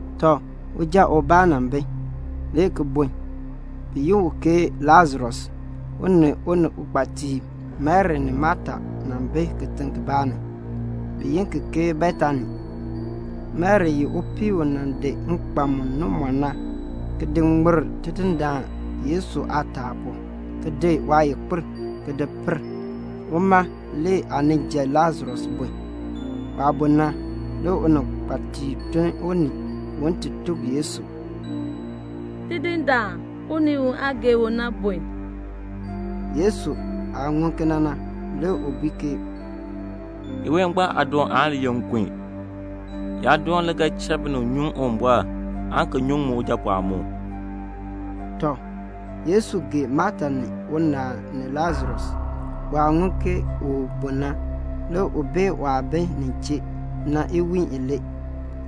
Tɔ, uja ubaa nan bi, le ki bun, bi yi u ke Lasarus. U ni uninkpatiib Mari ni Mata nan bi kitiŋ kibaa ni, bi yi ki ke Betani. (Mari ye upii u nan di nkpan mu ŋan na, ki di ŋmir Tidindaan Yesu aataa pu, ki di waayikpir ki di per. Uma le aaninja Lasarus bun.) Waah bun na, le uninkpatiib tun unii un ti tuk Yesu, "Tidindaan, unii u aa gee u na bun." Yesu aah ŋun kena na, le u bui ke, "Iween ngbaan aadoon aan li ye nkun. Yaadoon le ga cha binib nyuŋ Uwumbɔr aan ki nyuŋ min Ujapɔɔn mu." Tɔ, Yesu gee Mata ni unaal ni Lasarus. Waah ŋun ke u bun na, le u bee waah bi nin chee na iwiin ilee.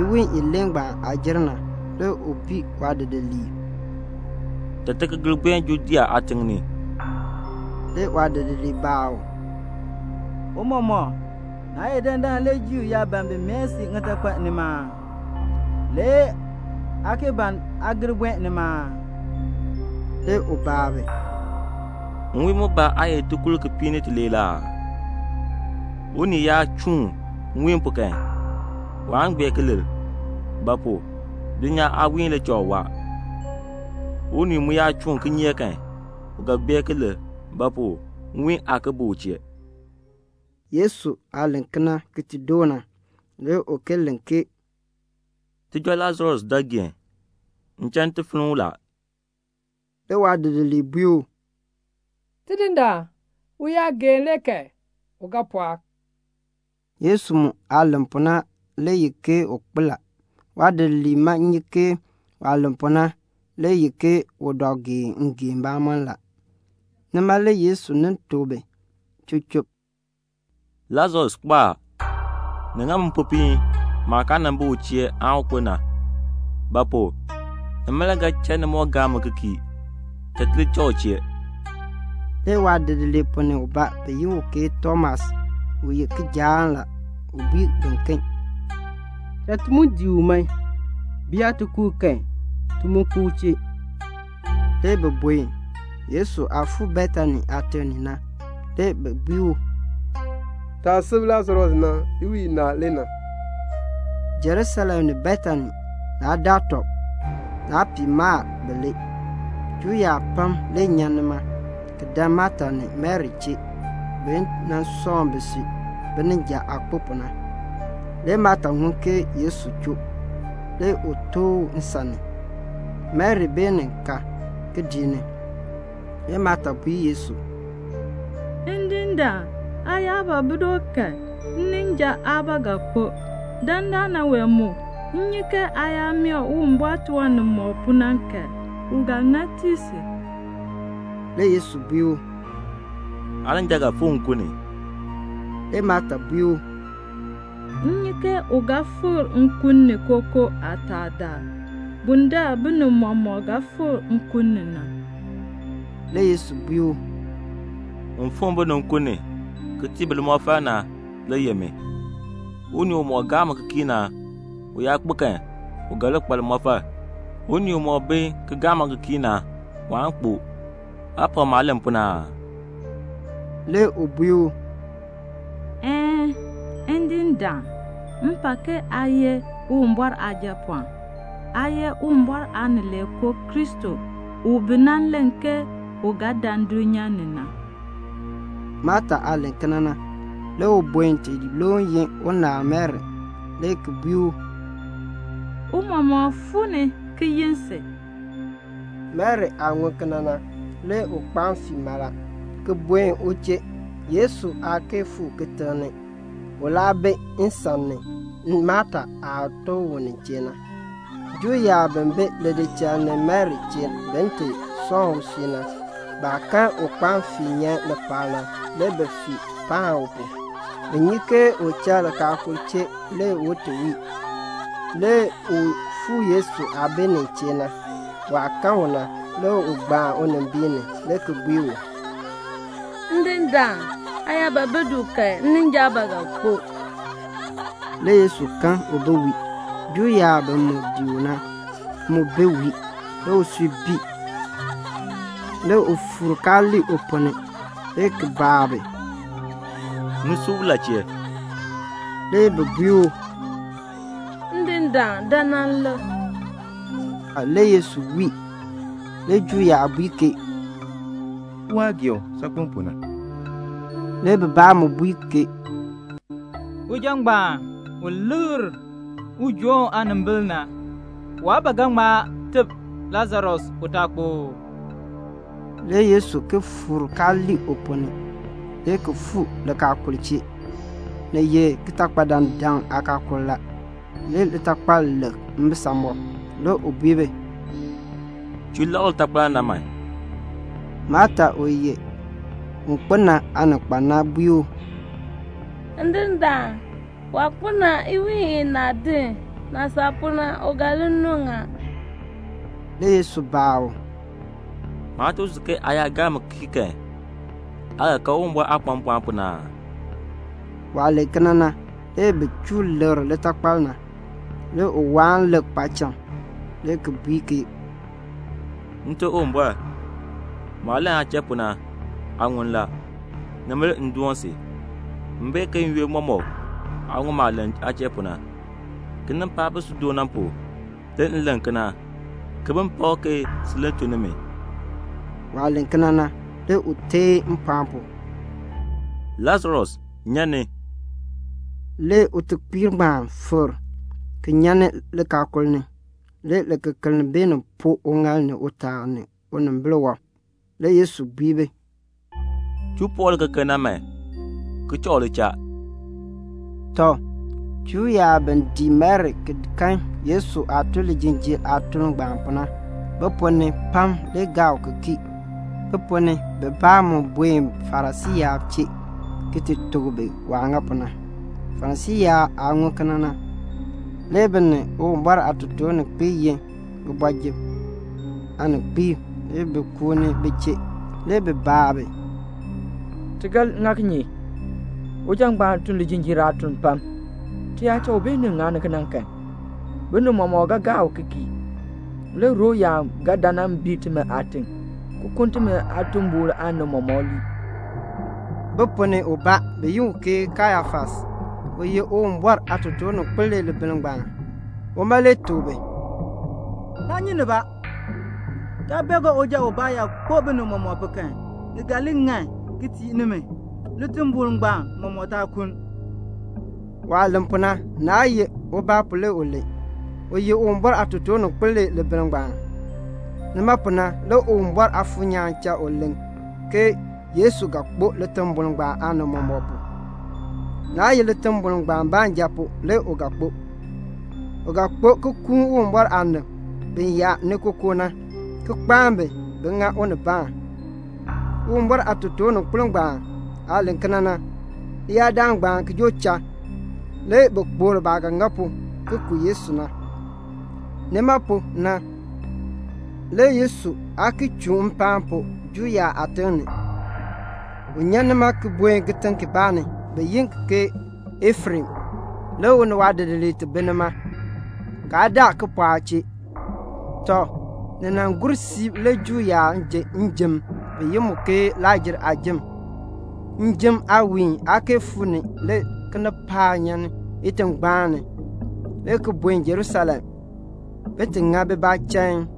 Iwiin ilee ngbaan aah jer na, le u bui waadidiliib, "Cha ti ki gir buen Judea aatiŋ ni." Le waadidiliib baa u, "Tiicha, naa ye dandana le Juu yaab ban bin mae si ŋitakpal nima aa? Le aa ki ban aa gir buen nima aa?" Le u baa bi, "Nwiin mbaa aa ye tikur kipiik ni tilee ee? Unii yaa chuun nwiin pu kan, waan gbeer ki lir; ba pu? dulnyaa aawiihn le cha u waa. Unii mu yaa chuun kinyeek kan, u ga gbeer ki lir; ba pu? nwiihn aa ki bi u chee." Yesu aah len kena ki ti doo na, le u ki len ke, "Tijɔ Lasarus dɔ geen. M cha m ti finn u la." Le waadidiliib bui u, "Tidindaan, u yaa geen le kan, u ga pɔɔk." Yesu mu aah len pu na le ye ke u kpo la. Waadidiliib ma nyi ke waah len pu na le ye ke u dɔ geen ngeen mbamɔm la. Nima le Yesu nin tuk bi chub chub, "Lasarus kpo a. Ni ŋa mi mpopiin maah kaa nan bi u chee aan u kpo na; ba pu? nima le ga cha ni moo gaa mi ki kii. Cha ti li cha u chee." Le waadidiliib ponn ni ubaa, bi yi u ke Tomas u ye kijaan la, u bui biken, "Cha ti mu dii u man, bi yaa ti ku u kan, ti mu kpo u chee." Le bi buen. Yesu aah fuu Betani aatiŋ ni na, le bi bui u, "Taah sub Lasarus na, iwiin inaa le na." Jerusalem ni Betani, naa daa tɔb, naa pii mal bilee. Juu yaab pam le nyan nima, ki dan Mata ni Mari chee, bi nan sɔŋ bisui, bininja aah kpo pu na. Le Mata ŋun ke Yesu choo. Le u tooh u nsan ni. Mari beenin ka kidiik ni. Le Mata bui Yesu, "Ndindaan, aa yaa ba bi du kan, nninja aa ba ga kpo. Dandana wee mu, m nyi ke aa yaa mee Uwumbɔr tiwan nimɔk pu na kan, u ga tii si." Le Yesu bui u, "Aaninja ga fikr nkun ni." Le Mata bui u, "M nyi ke u ga fikr nkun ni kookoo aataadaal, bundaln binib mɔmɔk ga fikr nkun ni na." Le Yesu bui u, "Un fikr binib nkun ni, ki tii bi limɔfal na, le ye min. Unii umɔk gaa mi ki kii na, u yaa kpo kan, u ga li kpa limɔfal. Unii umɔk bi ki gaa mi ki kii na, waan kpo. Aa pak maah len pu na aa?" Le u bui u, "Een, Ndindaan, m pak ke aa ye Uwumbɔr Aajapɔɔn. Aa ye Uwumbɔr Aanileekoo Kristo bi nan len ke u ga dan dulnyaa ni na." Mata aah len kena na, le u buen ti loon yi unaal Mari, le ki bui u, "Tiicha fuu ni, ki yi si." Mari aah ŋun kena na, le u kpaan fii mala, ki buen u chee; Yesu aa kee fuu ni kitiŋ ni, u laa bi nsan ni Mata aah tooh u nin chee na. Juu yaab bi bi lidichal ni Mari chee bin ti sɔŋ usui na, baah kan u kpaan fii nyan lipaal na, le bi fii paan u pu. Bi nyi ke u cha likaakul chee le u ti wii. Le u fuu Yesu aah bi nin chee na. Waah kan u na, le u gbaan unimbiin ni, le ki bui u, "Ndindaan, aa yaa ba bi du kan, nninja aa ba ga kpo." Le Yesu kan u bi wii. Juu yaab bi mu dii u na, mu bi wii. Le usui bii. Le u fuur kaa lii u ponn ni, le ki baa bi, "Ni sub u la chee?" Le bi bui u, "Ndindaan, dan nan lik." Le Yesu wii. Le Juu yaab bui ke, "Lik waah gee u saakpen pu na." Le bibaa mu bui ke, "Uja ngbaan u likr ujoon aanimbil na, waa ba ga ŋma teb Lasarus u taa kpo oo?" Le Yesu ki fuur kaa lii u ponn ni, le ki fuu likaakul chee. Ni ye kitakpadandaŋ aakaakul la. Le litakpal lek mbisamɔb. Le u bui bi, "Chuu lekr litakpal na man." Mata, u ye un kpo na aaninkpan na bui u, "Ndindaan, waah kpo na, iwiin inaa din. Naah saa pu na, u ga li nuŋ a." Le Yesu baa u, "Maa tuk si ke aa yaa gaa mi ki kii kan, aa ga kan Uwumbɔr aah kpa mpɔɔn pu na aa?" Waah len kena na, le bi chuu lekr litakpal na. Le u waan lik paacham le ki bui ke, "Nte Uwumbɔr, maah len aa chee pu na, aa ŋun la. Nima le m doon si. M bee ke n-yoonn mɔmɔk aa ŋun maah len aa chee pu na. Kinipaak bi si du na, bima le pu, le m len kena, ke bin pak ke sin le tun ni mi." Waah len kena na, le u teen mpɔɔn pu, "Lasarus, nyan ni." Le utekpiir ngbaan fikr, ki nyan ni likaakul ni. Le likekeln beenin poo uŋaal ni utaa ni unimbil wɔb. Le Yesu bui bi, "Chuu poor likekeln na man, ki cha u li cha." Tɔ, Juu yaab bi dii Mari ki kan Yesu aah tun lijinjiir aatuln ngbaan pu na, bi ponn ni pam le gaa u ki kii. Bi ponn ni bibaa mu buen Farisii yaab chee ki ti tuk bi waah ŋa pu na. Farisii yaab aah ŋun kena na, le bi ni Uwumbɔr aatotoorninkpiib yin kooti ni aaninkpiib, le bi kuuni bi chee. Le bi baa bi, "Ti ga ŋa kinye? uja ngbaan tun lijinjiir aatun pam. Ti yaa cha u beenin ŋani kena kan, binib mɔmɔk ga gaa u ki kii; le Rom yaab ga dan nan bii timi aatiŋ, ki kuln timi aatimbol aanib mɔmɔk lii." Bi ponn ni ubaa, bi yi u ke Kayafas, u ye Uwumbɔr aatotoorninkpil le libiln ngbaan, uma le tuk bi, "Naa nyi nibaa, kaa bee ke uja ubaa yaa kpo binib mɔmɔk pu kan, ni ga li ŋan ki tii nimi, litimbol ngbaan mɔmɔk taa kuln." Waah len pu na, naa ye ubaa pu le u len. U ye Uwumbɔr aatotoorninkpil le libiln ngbaan. Nima pu na le Uwumbɔr Aafuur nyaan cha u len ke Yesu ga kpo litimbol ngbaan aanib mɔmɔk pu. Naa ye litimbol ngbaan baanja pu le u ga kpo. U ga kpo ki kuun Uwumbɔr aanib bi yaa ni kookoo na, ki kpaan bi, bin ŋa unibaan. Uwumbɔr aatotoorninkpil ngbaan aah len kena na, leyaadaal ngbaan ki joo cha, le bi kpokl baah ga ŋa pu ki ku Yesu na. Nima pu na le Yesu aa ki chuun mpaan pu Juu yaab aatiŋ ni. U nyan nima ki buen kitiŋ kibaa ni, bi yi ki ke Efrem, le u ni waadidiliib ti bi nima. Kaa daa kipɔɔk chee. Tɔ, ni nan gur siib le Juu yaab ji njim, bi yi mu ke Lakr-jer aajim. Njim aawiin aa kee fuu ni le kinipaak nyan itingbaan ni le ki buen Jerusalem, bin ti ŋa bibaa chain.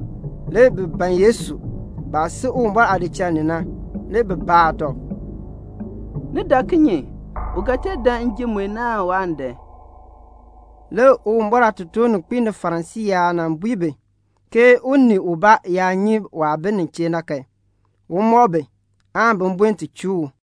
Le bi ban Yesu. Baah si Uwumbɔr aadichal ni na, le bi baa tɔb, "Ni dak kinye? U ga tee dan njim mue ni aan waan dan?" Le Uwumbɔr aatotoorninkpiib ni Farisii yaab nan bui bi ke unii ubaa yaa nyi waah bi nin chee na kan, un mɔk bi, aan bi buen ti chuu u.